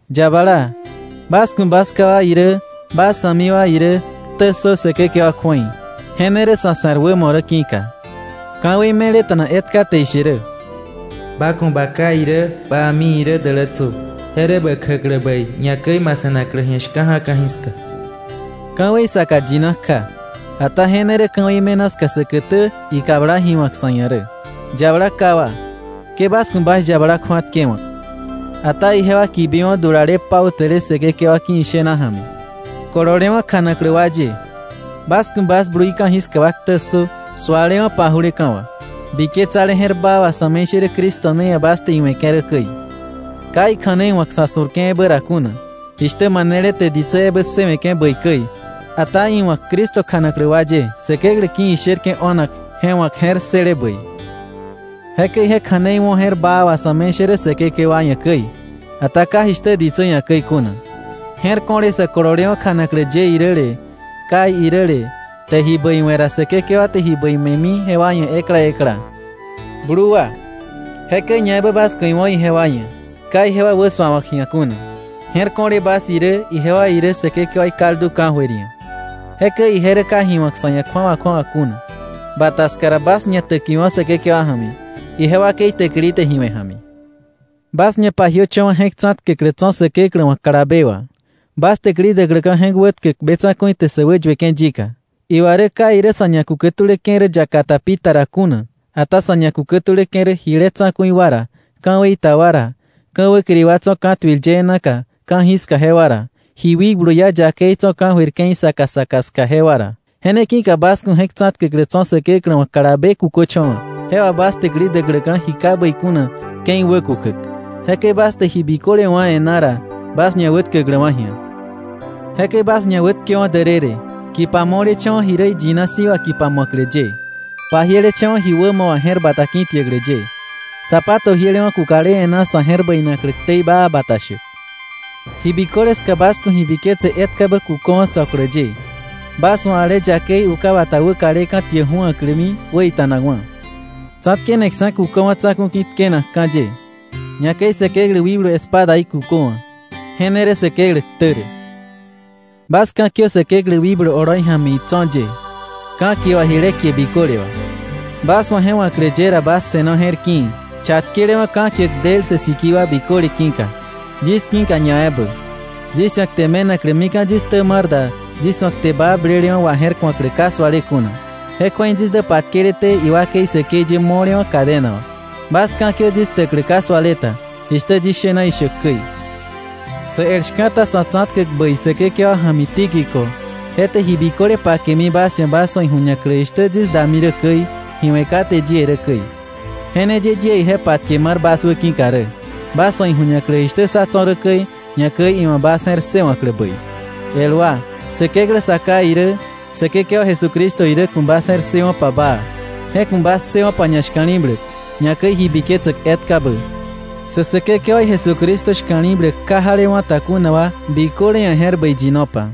Yabala, bas ku̱ bas ká wa irä bas a̱mi wa irä ktä ssö Säkekewa kju̱ei, je ne rä sa̱ se̱r wämo rä ki̱ka. Ka̱wei meleta̱na etka te ishe rä: “Ba ku̱ ba ká irä ba a̱mi irä dälätsö, je rä bä kjäklä bäi, ñakäi ma se̱naklä shka̱ja̱ ka̱jiska.” Ka̱wei saka yina kja, ata je ne rä ka̱wei me̱na ska säkätä ikabla ji wa̱k sa̱ ia̱ rä. Yabala ká wa, ke bas ku̱ bas yabala kju̱atkewa̱k. Ata ijewa kibiwo̱ dulale pautäle Säkekewa ki̱ ishena ja̱mi. Kololewa̱ kjanaklä wa ye, bas ku̱ bas blui ka̱jiska wa ktä ssö sualewa̱ paju̱leka̱ wà, biketsale je̱r baa wà sa̱me̱ishärä Cristo ne ia̱ bas te iwe̱ke̱ rä käi, ka ikja̱nei wa̱k sa̱ su̱rke̱ ebä ra kuna, jishtä manele te ditsä ebä ssëwe̱ke̱ bäi käi, ata iwa̱k Cristo kjanaklä wa ye Säkeklä ki̱ isherke̱ o̱nak je wa̱k je̱r ssële bäi. Jekäi je kja̱nei wo̱ je̱r baa wà sa̱me̱ishärä Säkekewa ia̱ käi, ata ka jishtä ditsä ia̱ käi kuna, je̱r ko̱le sä kololewa̱ kjanaklä ye iräle, kai iräle, te ji bäi we̱ ra, Säkekewa te ji bäi me̱mi jewa ia̱ ekla ekla. Blu wa, jekäi ñaebä bas ku̱ iwo̱ ijewa ia̱, ka ijewa wäsuawa̱k ji̱a kuna, je̱r ko̱le bas irä, ijewa irä Säkekewaí kaldu ka̱jöir ia̱. Jekäi ije rä ka ji wa̱k sa̱ ia̱ kju̱awa kju̱awa kuna. Bata ska ra, bas ñatäkiwo̱ Säkekewa ja̱mi, ije wakei täkili te ji we̱ ja̱mi. Bas ñapajiöcha̱wa̱ je̱k tsa̱tkäklä tso̱ Säkeklä wa̱ kalabe wà, bas täkili däkläka̱ je̱k wätkäk be tsa̱ku̱i te sä wäyueke̱ yika. Iwa rä ka irä sa̱ ñakukätuläke̱ rä yaka ta pita ra kuna, ata sa̱ ñakukätuläke̱ rä jile tsa̱ku̱i wa ra, ka̱wei ta wa ra, ka̱ wäkiri wa tso̱ ka̱tuil yee naka ka̱jiska jewa ra, ji wikblu iá yakei tso̱ ka̱jöir ke̱i saka saka ska jewa ra. Je ne ki̱ka bas ku̱ je̱k tsa̱tkäklä tso̱ Säkeklä wa̱ kalabe kuköcho̱wa̱, je wà bas täkili däkläka̱ ji ka bäi kuna ke̱i wäkukäk, jekäi bas te ji biköle wá̱ e̱ná ra, bas ñawätkäkläwa̱ ji̱a. Jekäi bas ñawätkewo̱ därërë, kipa mo̱lecha̱wa̱ ji rä iyina si̱ wà kipa mu̱aklä ye, pajielecha̱wa̱ ji wämo wà je̱r bata ki̱tiäklä ye, zapato jielewa̱ kukale e̱ná sa̱ je̱r bäinaklä ktei baa bata shäk. Ji biköle ska bas ku̱ ji biketse etkabä kuköwa̱ söklä ye, bas wa̱ ale yakei uka bata wäkaleka̱ tiä ju̱aklämi wäita̱nakwa̱. Tsa̱tkeneksa̱ kuköwa̱ tsa̱ku̱ ki̱ tkenakka̱ ye. Ñakäi Säkeklä wikblu espadaí kuköwa̱. Je ne rä Säkeklä ktä rä. Bas ka̱kiö Säkeklä wikblu oloi ja̱mi itso̱ ye, ka̱kie wà jile kie biköle wà. Bas wa̱ je wa̱klä ye ra bas se̱no je̱r ki̱i̱, chatkelewa̱ ka̱kiäk del sä sikii wa biköle ki̱ka, yis ki̱ka ñaebä, yis ia̱ kte me̱naklä mika̱ yis ktä mar da yis wa̱ kte baa blelewa̱ waje̱rku̱aklä ka suale kuna. Je kju̱ei yis dä patkeleté iwakei säkei ye mo̱lewa̱ cadena wà. Bas ka̱kiö yis ktäklä ka suale ta, jishtä yis shena ishäk käi. Sä el shka̱ta sa̱ tsa̱tkäk bäi Säkekewa ja̱mi Tíquico, je te ji biköle pakemi bas ia̱ bas wa̱ iju̱ñaklä jishtä yis dami rä käi, ji we̱ kate yie rä käi. Je ne ye yie ije patke mar bas wäki̱ka rä, bas wa̱ iju̱ñaklä jishtä sá tso̱ rä käi, ñakäi iwa̱ bas je̱r ssëwa̱klä bäi. El wa, Säkeklä Sa Ká irä Säkekewa Jesucristo irä ku̱ bas ssëwo̱pa baa, je ku̱ bas ssëwo̱pa ñashka̱li̱bläk, ñakäi ji biketsäk etkabä. Sä Säkekewaí Jesucristo shka̱li̱bläk ka jalewa̱ ta kuna wa biköle ia̱ je̱r bäi yinopa.